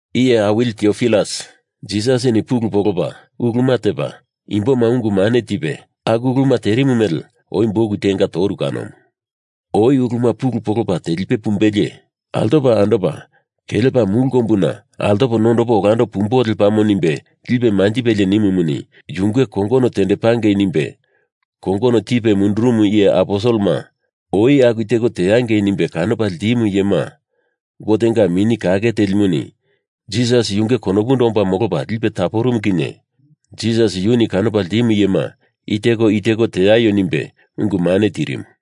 Iye awili Tiopilas, Jisasini pulu polopa uluma tepa imboma ungu mane tipe aku uluma terimu mele oi buk tenga toru kanomu. Oi uluma pulu polopa telipe pumbelie altopa andopa kelepa mulu kombuna altopo nondopo olando pumbo lepamo nimbe lipe manjipelie nimumuni yunge kongono tendepangei nimbe kongono tipe mundurumu iye aposelema oi aku teko teangei nimbe kanopa ltimu iyema Gotenga Mini Kake telimuni Jisas yunge konopundo omba molopa lipe taporumu kinye Jisas yuni kanopa ltimu iyema i teko i teko teaio nimbe ungu mane tirimu.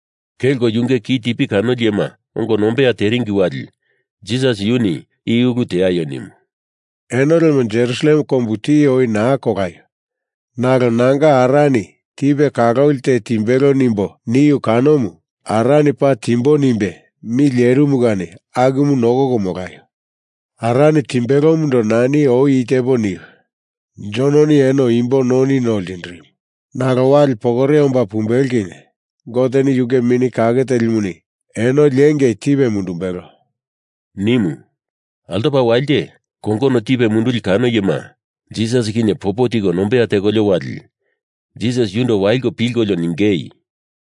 Kelko yunge kitipi kanoli iyema ongo nombeya teringi wali Jisas yuni i ulu teaio nimu. “Eno lemo Jerusalem kombu tiye oi naa kolaio, nalo nanga Arani tipe kaloli te timbelo nimbo niu kanomu Arani paa timbo nimbe mi lerimu kani akumu nokoko molaio. Arani timbelomundo nani oi i tepo niu. Jononi eno imbo noni no ltindirimu, nalo wali pokore omba pumbelo kinye Goteni yunge Mini Kake Telimuni eno liengei tipe mundumbelo,” nimu. Altoko walite, kongono tipe munduli kano iyema Jisas kinye popo tiko nombeya tekolio wali, Jisas yundo waliko pilkolio ningei,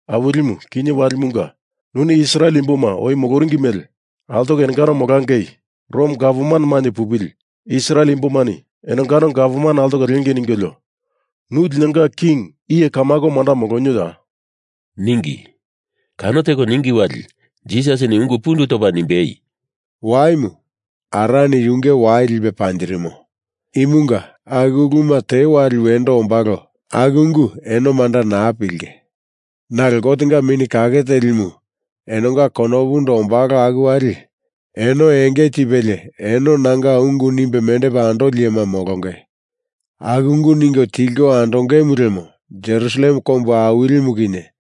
“Awilimu kinye walimunga nuni Israel imboma oi moloringi mele altoko enongano molangei Rom gavman mainye pupili Israel imbomani enongano Gavman altoko lengei ningolio nu linonga king iye kamako manda molonioya?” ningi. Kano teko ningi wali Jisasini ungu pundu topa nimbei, “Waimu Arani yunge wai lipe panjirimo. Imunga aku uluma te wali wendo ombalo aku ungu eno manda naa pilinge. Nalo Gotenga Mini Kake Telimu enonga konopundo ombalo aku wali eno enge tipelie eno nanga ungu nimbe mendepa andoli iyema molonge. Aku ungu ningo tilko andongemu lemo Jerusalem kombu awilimu kinye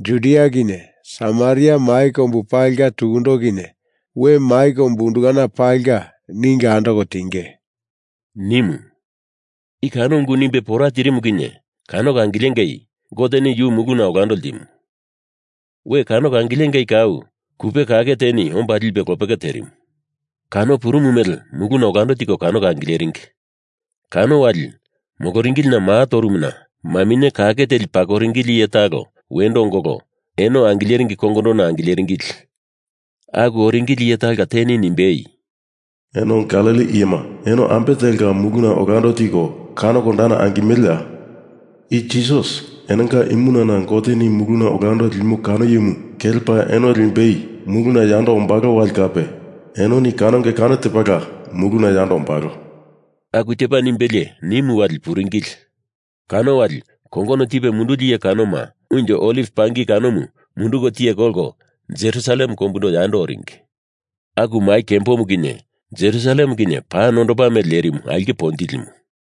Judia kinye Samaria mai kombu palinga tukundo kinye we mai kombu undukana palinga ningo andoko tinge,” nimu. I kano ungu nimbe pora tirimu kinye kanoko angilengei Goteni yu muluna olando ltimu. We kanoko angilengei kau kupe kake teni omba lipe lopeke terimu. Kano purumu mele muluna olando tiko kanoko angileringi. Kano wali moloringilina maa torumuna maminye kake teli pakoringili iye talo wendo ongolo eno angileringi kongondona angileringili. Aku oringili iye talonga teni nimbei, “Eno Galili iyema eno ambe telka muluna olando tiko kanoko dana angimeleya? I Jisas enonga imunana Goteni muluna olando limo kano iyemu kelepa eno limbei muluna yando ombalo wali kape enoni kanonge kano tepala muluna yando ombalo,” aku tepa nimbelie, nimu wali puringili. Kano wali kongono tipe munduli iye kanoma unjo oliv pangi kanomu munduko tiye kolko Jerusalem kombundo yando oringi. Aku mai kembomu kinye Jerusalem kinye paa nondopa mele lerimu aulke ponjilimu.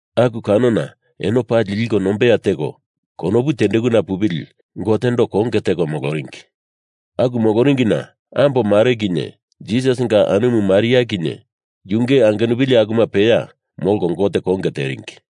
Aku kanona eno pali liko nombeya teko konopu tendekuna pupili Gotendo konge teko moloringi. Aku moloringina ambo mare kinye Jisasinga anumu Maria kinye yunge angenupili akuma peya molko Gote konge teringi.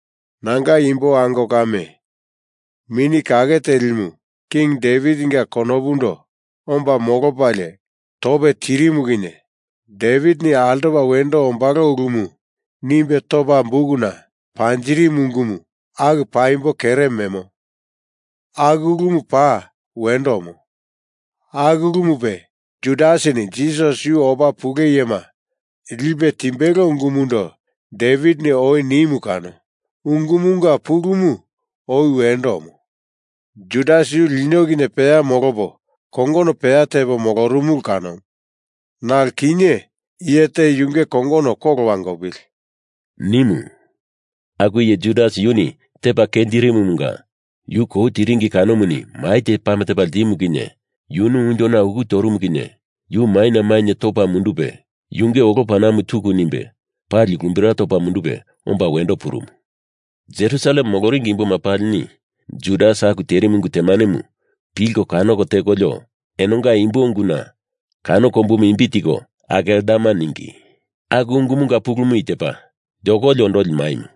“Nanga imbo ango kame, Mini Kake Telimu King Devitinga konopundo omba molopalie tope tirimu kinye Devitini altopa wendo ombalo ulumu nimbe topa bukuna panjirimu ungumu aku paimbo kere memo. Aku ulumu paa wendo omo. Aku ulumupe Judasini Jisas yu opa pule iyema lipe timbelo ungumundo Devitini oi nimu kano ungumunga pulumu oi wendo omo. Judas yu lino kinye peya molopo kongono peya tepo molorumulu kanomu. Nalo kinye iye te yunge kongono kolo wangopili,” nimu. (Aku iye Judas yuni tepa kenjirimumunga yu kou tiringi kanomuni mai te pame tepa ltimu kinye yunu unjona uku torumu kinye yu maina mainye topa mundupe yunge olo panamu tuku nimbe pali lumbira topa mundupe omba wendo purumu. Jerusalem moloringi imboma palini Judas aku terimu ungu temanemu pilko kanoko tekolio enonga imbo unguna kano kombumu imbi tiko Akeldama ningi. Aku ungumunga pulumu i tepa: Yokoli Ondoli Maimu.)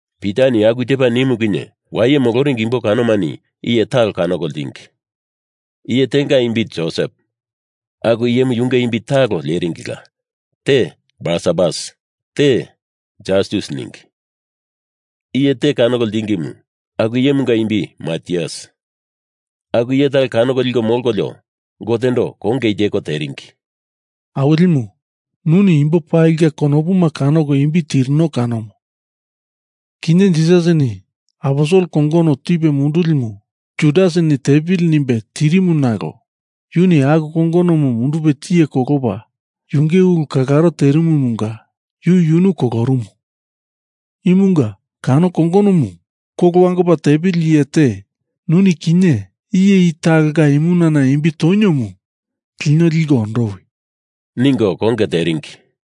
Pitani aku tepa nimu kinye waye moloringi imbo kanomani iye talo kanoko ltingi. Iye tenga imbi Josep, aku iyemu yunge imbi talo leringila, te Barsabas, te Jastus ningi. Iye te kanoko ltingimu aku iyemunga imbi Matias. Aku iye talo kanoko liko mondokolio Gotendo konge i teko teringi: “Awilimu, nuni imbo palinga konopuma kanoko imbi tirino kanomu. Kinye Jisasini aposel kongono tipe mundulimu Judasini tepili nimbe tirimu nalo yuni aku kongonomu mundupe tiye kolopa yunge ulu kalaro terimumunga yu yunu kolorumu. Imunga kano kongonomu kolo wangopa tepili iye te nuni kinye iye i talonga imunana imbi toniomu lino liko ondowi,” ningo konge teringi.